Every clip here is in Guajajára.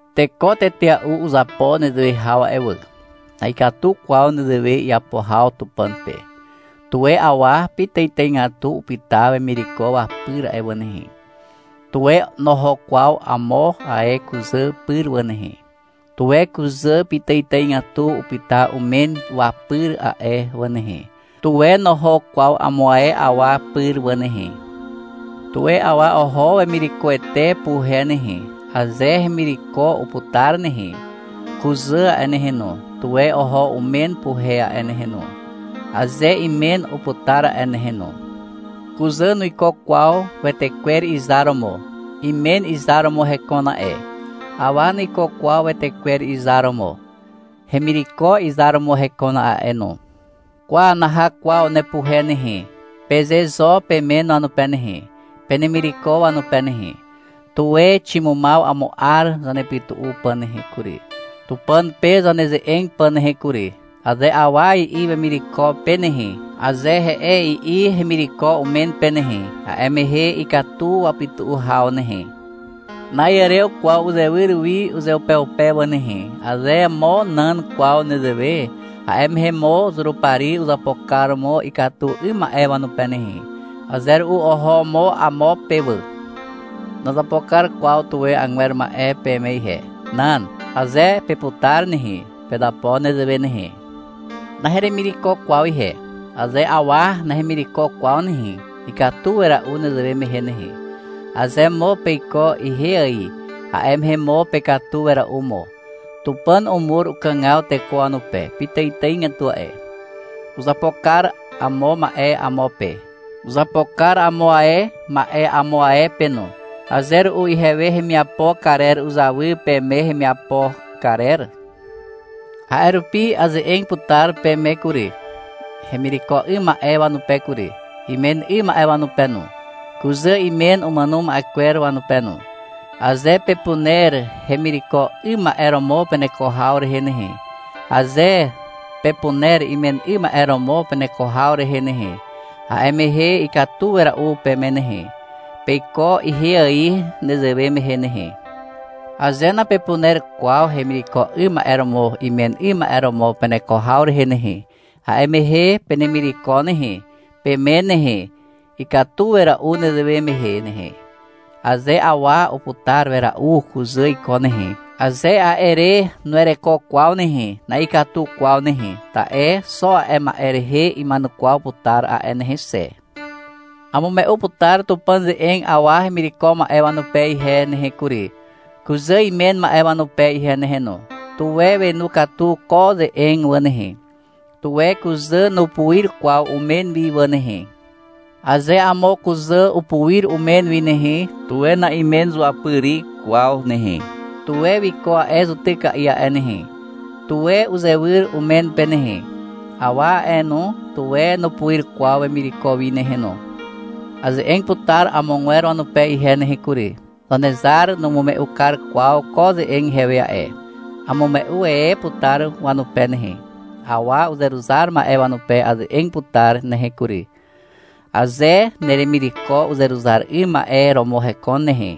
Teko tetea'u uzapo nezewe haw a'e wà. Na'ikatu kwaw nezewe iapo haw Tupàn pe. Tuwe awa pitàitàigatu upyta wemireko wapyr a'e wà nehe. Tuwe noho kwaw amo ae kuzà pyr wà nehe. Tuwe kuzà pitàitàigatu upyta umen wapyr a'e wà nehe. Tuwe noho kwaw amo ae awa pyr wà nehe. Tuwe awa oho wemirekoete puhe nehe, aze hemireko uputar nehe. Kuzà a'e nehe no, tuwe oho umen puhe a'e nehe no, aze imen uputar a'e nehe no. Kuzà nuiko kwaw wetekwer izar romo. Imen izar romo hekon a'e. Awa nuiko kwaw wetekwer izar romo. Hemireko izar romo hekon a'e no. — Kwa, naha kwaw nepuhe nehe, peze zo pemen wanupe nehe, penemireko wanupe nehe. — Tuwe ximumaw amo 'ar zanepytu'u pà nehe kury, Tupàn pe zaneze'eg pà nehe kury, aze awa i'i wemireko pe nehe, aze — He'e, i'i hemireko umen pe nehe, a'e mehe ikatu wapytu'u haw nehe. Na'iàrew kwaw uzewyr wi uzeupeupe wà nehe. Aze mo nan kwaw nezewe, a'e mehe mo Zurupari uzapo kar mo ikatu 'ym ma'e wanupe nehe. Aze ru'u oho mo amo pe wà. Nazapo kar kwaw tuwe agwer ma'e peme ihe. Nan. Aze peputar nehe, pezapo nezewe nehe. Naheremireko kwaw ihe. Aze awa nahemireko kwaw nehe, ikatu wera'u nezewe mehe nehe. Aze mo peiko ihe ài, a'e mehe mo pekatu wera'u mo. Tupàn umur ukàgaw teko wanupe pitàitàigatu a'e. Uzapo kar amo ma'e amo pe. Uzapo kar amo ae ma'e amo ae pe no. Aze ru'u ihewe hemiapo karer uzawy peme hemiapo karer. A'e rupi aze'eg putar peme kury, hemireko 'ym ma'e wanupe kury, imen 'ym ma'e wanupe no, kuzà imen umàno ma'e kwer wanupe no. Aze pepuner hemireko 'ym ma'e romo peneko haw rehe nehe, aze pepuner imen 'ym ma'e romo peneko haw rehe nehe, a'e mehe ikatu wera'u peme nehe. Peiko ihe ài nezewe mehe nehe. Aze napepuner kwaw hemireko 'ym ma'e romo imen 'ym ma'e romo peneko haw rehe nehe, a'e mehe penemireko nehe, pemen nehe. Ikatu wera'u nezewe mehe nehe. Aze awa uputar wera'u kuzà iko nehe, aze a'e re nuwereko kwaw nehe, na'ikatu kwaw nehe. Ta'e xo a'e ma'e rehe ima'enukwaw putar a'e nehe xe. Amume'u putar Tupàn ze'eg awa hemireko ma'e wanupe ihe nehe kury, kuzà imen ma'e wanupe ihe nehe no. Tuwe wenu katu ko ze'eg wà nehe. Tuwe kuzà nupuir kwaw umen wi wà nehe. Aze amo kuzà upuir umen wi nehe, tuwe na'imen zuapyri kwaw nehe. Tuwe wiko a'e zutyka'i a'e nehe. Tuwe uzewyr umen pe nehe. Awa a'e no, tuwe nupuir kwaw wemireko wi nehe no. Aze'eg putar amogwer wanupe ihe nehe kury. (Zanezar numume'u kar kwaw ko ze'eg ihewe a'e. Amume'u e putar wanupe nehe.) Awa uzeruzar ma'e wanupe aze'eg putar nehe kury. Aze neremireko uzeruzar 'ym ma'e romo hekon nehe,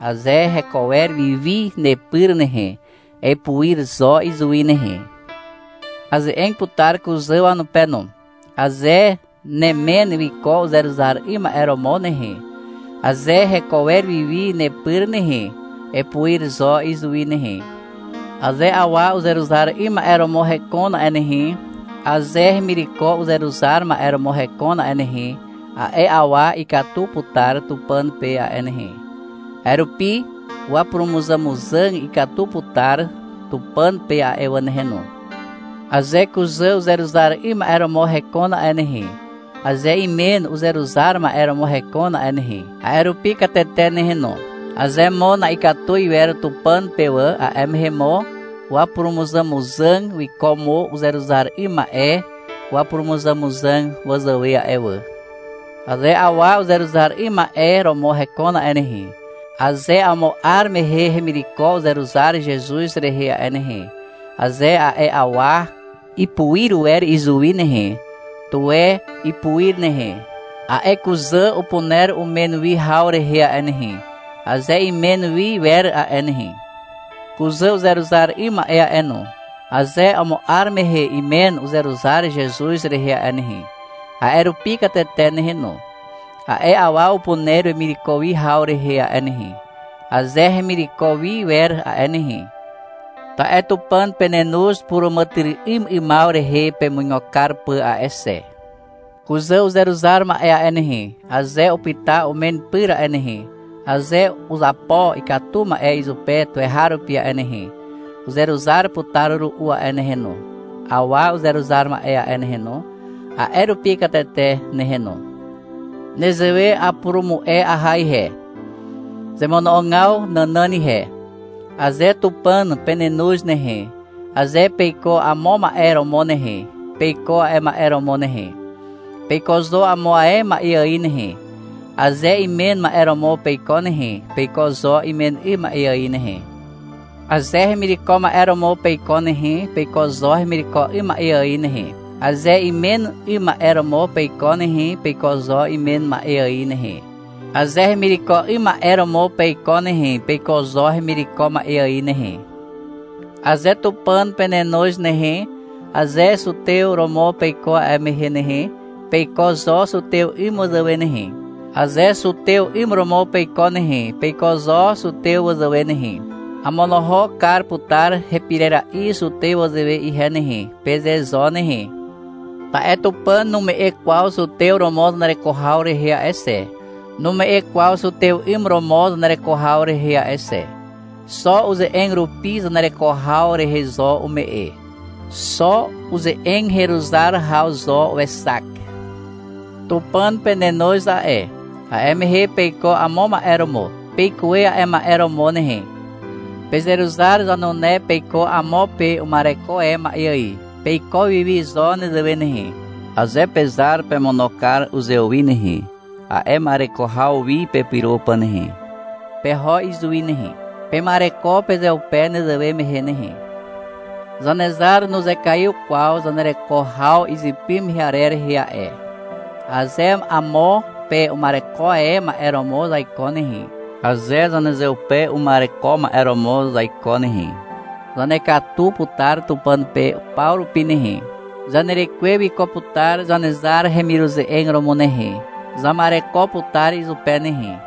aze heko wer wiwi nepyr nehe, epuir zo izuwi nehe. Aze'eg putar kuzà wanupe no. Aze nemen wiko uzeruzar 'ym ma'e romo nehe, aze heko wer wiwi nepyr nehe, epuir zo izuwi nehe. Aze awa uzeruzar 'ym ma'e romo hekon a'e nehe, aze hemireko uzeruzar ma'e romo hekon a'e nehe, a'e awa ikatu putar Tupàn pe a'e nehe. A'e rupi wapurumuzàmuzàg ikatu putar Tupàn pe a'e wà nehe no. Aze kuzà uzeruzar 'ym ma'e romo hekon a'e nehe, aze imen uzeruzar ma'e romo hekon a'e nehe, a'e rupi katete nehe no. Aze mo na'ikatu iwer Tupàn pe wà, a'e mehe mo wapurumuzàmuzàg wiko mo uzeruzar 'ym ma'e wapurumuzàmuzàg wazàwe a'e wà. Aze awa uzeruzar 'ym ma'e romo hekon a'e nehe, aze amo 'ar mehe hemireko uzeruzar Zezuz rehe a'e nehe, aze a'e awa ipuir wer izuwi nehe, tuwe ipuir nehe. A'e kuzà upuner umen wi haw rehe a'e nehe, aze imen wi wer a'e nehe. Kuzà uzeruzar 'ym ma'e a'e no, aze amo 'ar mehe imen uzeruzar Zezuz rehe a'e nehe, a'e rupi katete nehe no. A'e awa upuner wemireko wi haw rehe a'e nehe, aze hemireko wi wer a'e nehe. Ta'e Tupàn penenoz puràmàtyry'ym 'ymaw rehe pemuigo kar pà a'e xe. Kuzà uzeruzar ma'e a'e nehe, aze upyta umen pyr a'e nehe, aze uzapo ikatu ma'e izupe tuweharupi a'e nehe, uzeruzar putar ru'u a'e nehe no. Awa uzeruzar ma'e a'e nehe no, a'e rupi katete nehe no. Nezewe apurumu'e aha ihe, zemono'ogaw nànàn ihe. Aze Tupàn penenoz nehe, aze peiko amo ma'e romo nehe, peiko a'e ma'e romo nehe. Peiko zo amo ae ma'e ài nehe. Aze imen ma'e romo peiko nehe, peiko zo imen 'ym ma'e ài nehe. Aze hemireko ma'e romo peiko nehe, peiko zo hemireko 'ym ma'e ài nehe. Aze imen 'ym ma'e romo peiko nehe, peiko zo imen ma'e ài nehe. Aze hemireko 'ym ma'e romo peiko nehe, peiko zo hemireko ma'e ài nehe. Aze Tupàn penenoz nehe, aze zutew romo peiko a'e mehe nehe, peiko zo zutew 'ym wazàwe nehe. Aze zutew 'ym romo peiko nehe, peiko zo zutew wazàwe nehe. — Amonohok kar putar hepirera'i zutew wazàwe ihe nehe, peze zo nehe. Ta'e Tupàn nume'e kwaw zutew romo zanereko haw rehe a'e xe, nume'e kwaw zutew 'ym romo zanereko haw rehe a'e xe. Xo uze'eg rupi zanereko haw rehe zo ume'e. Xo uze'eg heruzar haw zo wexak. Tupàn penenoz a'e. A'e mehe peiko amo ma'e romo. Peikuwe a'e ma'e romo nehe. Pezeruzar zanune peiko amo pe uma'ereko e ma'e ài, peiko wiwi zo nezewe nehe. Aze pezar pemono kar uzewi nehe, a'e ma'ereko haw wi pepyro pà nehe, peho izuwi nehe. Pema'ereko pezeupe nezewe mehe nehe. Zanezar nuzekaiw kwaw zanereko haw izypy mehe arer rehe a'e. Aze amo pe uma'ereko e ma'e romo zaiko nehe, aze zanezeupe uma'ereko ma'e romo zaiko nehe, zanekatu putar Tupàn pe paw rupi nehe. Zanerekwe wiko putar Zanezar hemiruze'eg romo nehe, zama'ereko putar izupe nehe.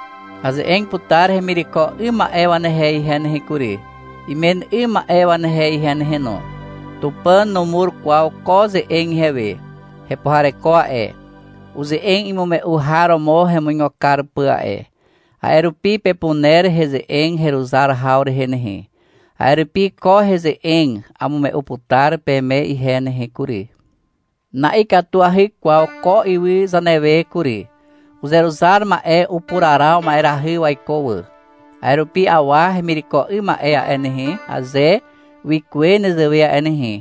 Aze'eg putar hemireko 'ym ma'e wanehe ihe nehe kury, imen 'ym ma'e wanehe ihe nehe no. Tupàn numur kwaw ko ze'eg ihewe. Hepuhareko a'e. Uze'eg imume'u har romo hemuigo kar pà a'e. A'e rupi pepuner heze'eg heruzar haw rehe nehe. A'e rupi ko heze'eg amume'u putar peme ihe nehe kury. Na'ikatuahy kwaw ko ywy zanewe kury. Uzeruzar ma'e upuraraw ma'erahy waiko wà. A'e rupi awa hemireko 'ym ma'e a'e nehe, aze wikuwe nezewe a'e nehe,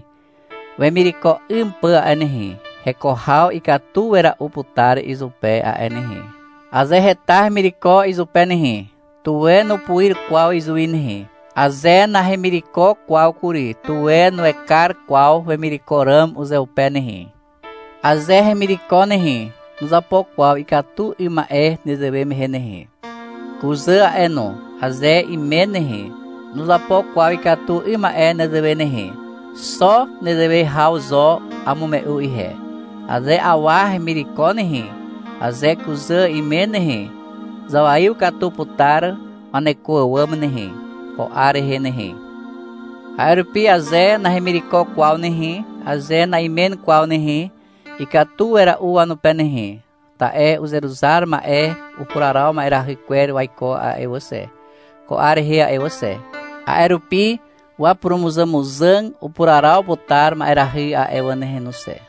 wemireko 'ym pà a'e nehe, heko haw ikatu wera'u putar izupe a'e nehe. Aze heta hemireko izupe nehe, tuwe nupuir kwaw izuwi nehe. Aze nahemireko kwaw kury, tuwe nuekar kwaw wemireko ràm uzeupe nehe. Aze hemireko nehe, nuzapo kwaw ikatu 'ym ma'e nezewe mehe nehe. Kuzà a'e no, aze imen nehe, nuzapo kwaw ikatu 'ym ma'e nezewe nehe. Xo nezewe haw zo amume'u ihe. Aze awa hemireko nehe, aze kuzà imen nehe, zawaiw katu putar waneko àwàm nehe, ko 'ar rehe nehe. A'e rupi aze nahemireko kwaw nehe, aze na'imen kwaw nehe, ikatu wera'u wanupe nehe, ta'e uzeruzar ma'e upuraraw ma'erahy kwer waiko a'e wà xe, ko 'ar rehe a'e wà xe. A'e rupi wapurumuzàmuzàg upuraraw putar ma'erahy a'e wà nehe no xe.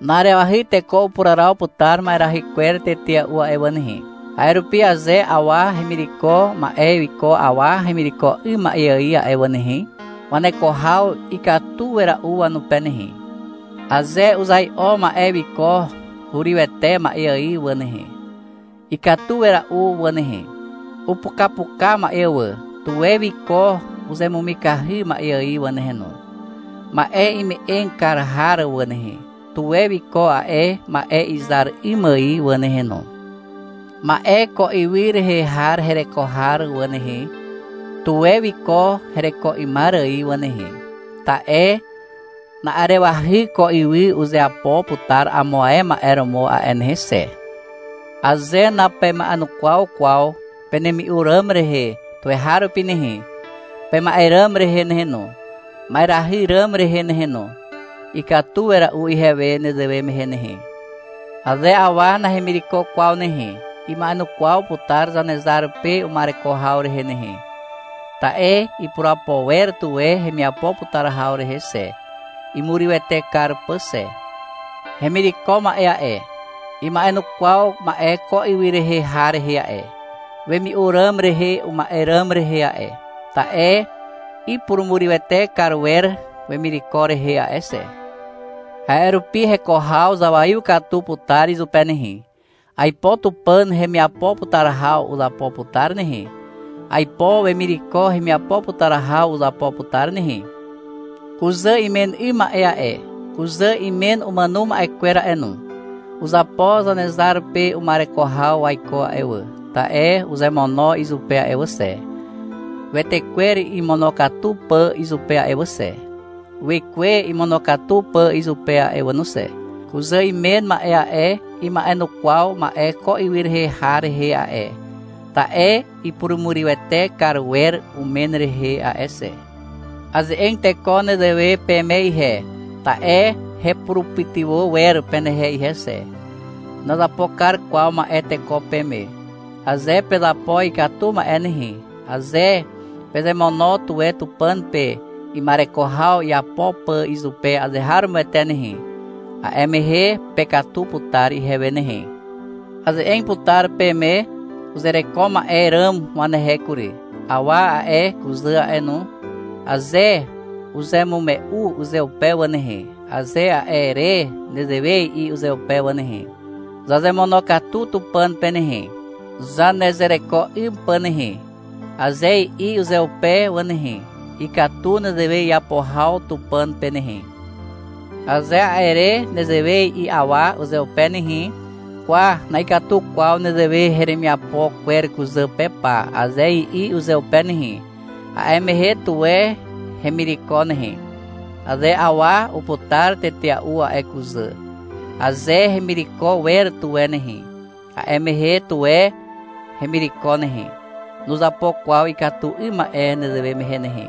Na'arewahy teko upuraraw putar ma'erahy kwer tetea'u a'e wà nehe. A'e rupi aze awa hemireko ma'e wiko awa hemireko 'ym ma'e ài a'e wà nehe, waneko haw ikatu wera'u wanupe nehe. Aze uzai'o ma'e wiko hurywete ma'e ài wà nehe, ikatu wera'u wà nehe. Upukapuka ma'e wà, tuwe wiko uzemumikahy ma'e ài wà nehe no. Ma'e ime'eg kar har wà nehe, tuwe wiko a'e ma'e izar 'ym ài wà nehe no. Ma'e ko ywy rehe har hereko har wà nehe, tuwe wiko hereko 'ymar ài wà nehe. Ta'e na'arewahy ko ywy uzeapo putar amo ae ma'e romo a'e nehe xe. Aze napema'enukwaw kwaw penemi'u ràm rehe tuweharupi nehe, pema'e ràm rehe nehe no, ma'erahy ràm rehe nehe no, ikatu wera'u ihewe nezewe mehe nehe. Aze awa nahemireko kwaw nehe, ima'enukwaw putar Zanezar pe uma'ereko haw rehe nehe. Ta'e ipurapo wer tuwe hemiapo putar haw rehe xe, imurywete kar pà xe. Hemireko ma'e a'e, ima'enukwaw ma'e ko ywy rehe har rehe a'e, wemi'u ràm rehe uma'e ràm rehe a'e. Ta'e ipurumurywete kar wer wemireko rehe a'e xe. A'e rupi heko haw zawaiw katu putar izupe nehe. Aipo Tupàn hemiapo putar haw uzapo putar nehe. Aipo wemireko hemiapo putar haw uzapo putar nehe. Kuzà imen 'ym ma'e a'e, kuzà imen umàno ma'e kwer a'e no, uzapo Zanezar pe uma'ereko haw waiko a'e wà, ta'e uzemono izupe a'e wà xe, wetekwer imonokatu pà izupe a'e wà xe, wekwe imonokatu pà izupe a'e wà no xe. Kuzà imen ma'e a'e, ima'enukwaw ma'e ko ywy rehe har rehe a'e, ta'e ipurumurywete kar wer umen rehe a'e xe. Aze'eg teko nezewe peme ihe, ta'e hepurupytywà wer penehe ihe xe. Nazapo kar kwaw ma'e teko peme. Aze pezapo ikatu ma'e nehe, aze pezemono tuwe Tupàn pe ima'ereko haw iapo pà izupe azeharomoete nehe, a'e mehe pekatu putar ihewe nehe. Aze'eg putar peme uzereko ma'e ràm wanehe kury. Awa a'e, kuzà a'e no, aze uzemume'u uzeupe wà nehe, aze a'e re nezewe i'i uzeupe wà nehe, — Zazemonokatu Tupàn pe nehe, zanezereko 'ym pà nehe, aze i'i uzeupe wà nehe, ikatu nezewe iapo haw Tupàn pe nehe. Aze a'e re nezewe i'i awa uzeupe nehe, — Kwa, na'ikatu kwaw nezewe heremiapo kwer kuzà pe pa, aze i'i uzeupe nehe, a'e mehe tuwe hemireko nehe. Aze awa uputar tetea'u a'e kuzà, aze hemireko wer tuwe nehe, a'e mehe, tuwe hemireko nehe. Nuzapo kwaw ikatu 'ym ma'e nezewe mehe nehe.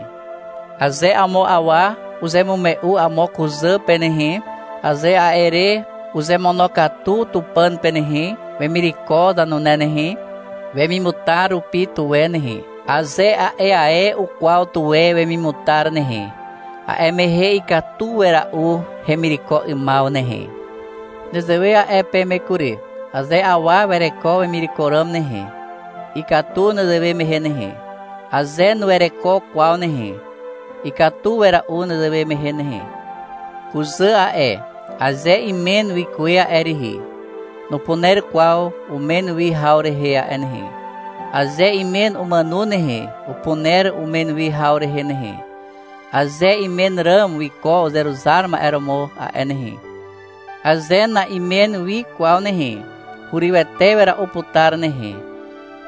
Aze amo awa uzemume'u amo kuzà pe nehe, aze a'e re uzemonokatu Tupàn pe nehe, wemireko zanune nehe, wemimutar rupi tuwe nehe, aze a'e ae ukwaw tuwe wemimutar nehe, a'e mehe ikatu wera'u hemireko 'ymaw nehe. Nezewe a'e peme kury. Aze awa wereko wemireko ràm nehe, ikatu nezewe mehe nehe. Aze nuwereko kwaw nehe, ikatu wera'u nezewe mehe nehe. Kuzà a'e, aze imen wikuwe a'e rihi, nupuner kwaw umen wi haw rehe a'e nehe. Aze imen umàno nehe, upuner umen wi haw rehe nehe, aze imen ràm wiko uzeruzar ma'e romo a'e nehe. Aze na'imen wi kwaw nehe, hurywete wera'u putar nehe.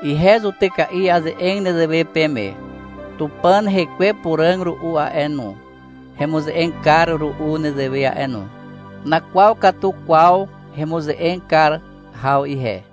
Ihe zutyka'i aze'eg nezewe peme. Tupàn Hekwe Puràg ru'u a'e no, hemuze'eg kar ru'u nezewe a'e no. Nakwaw katu kwaw hemuze'eg kar haw ihe.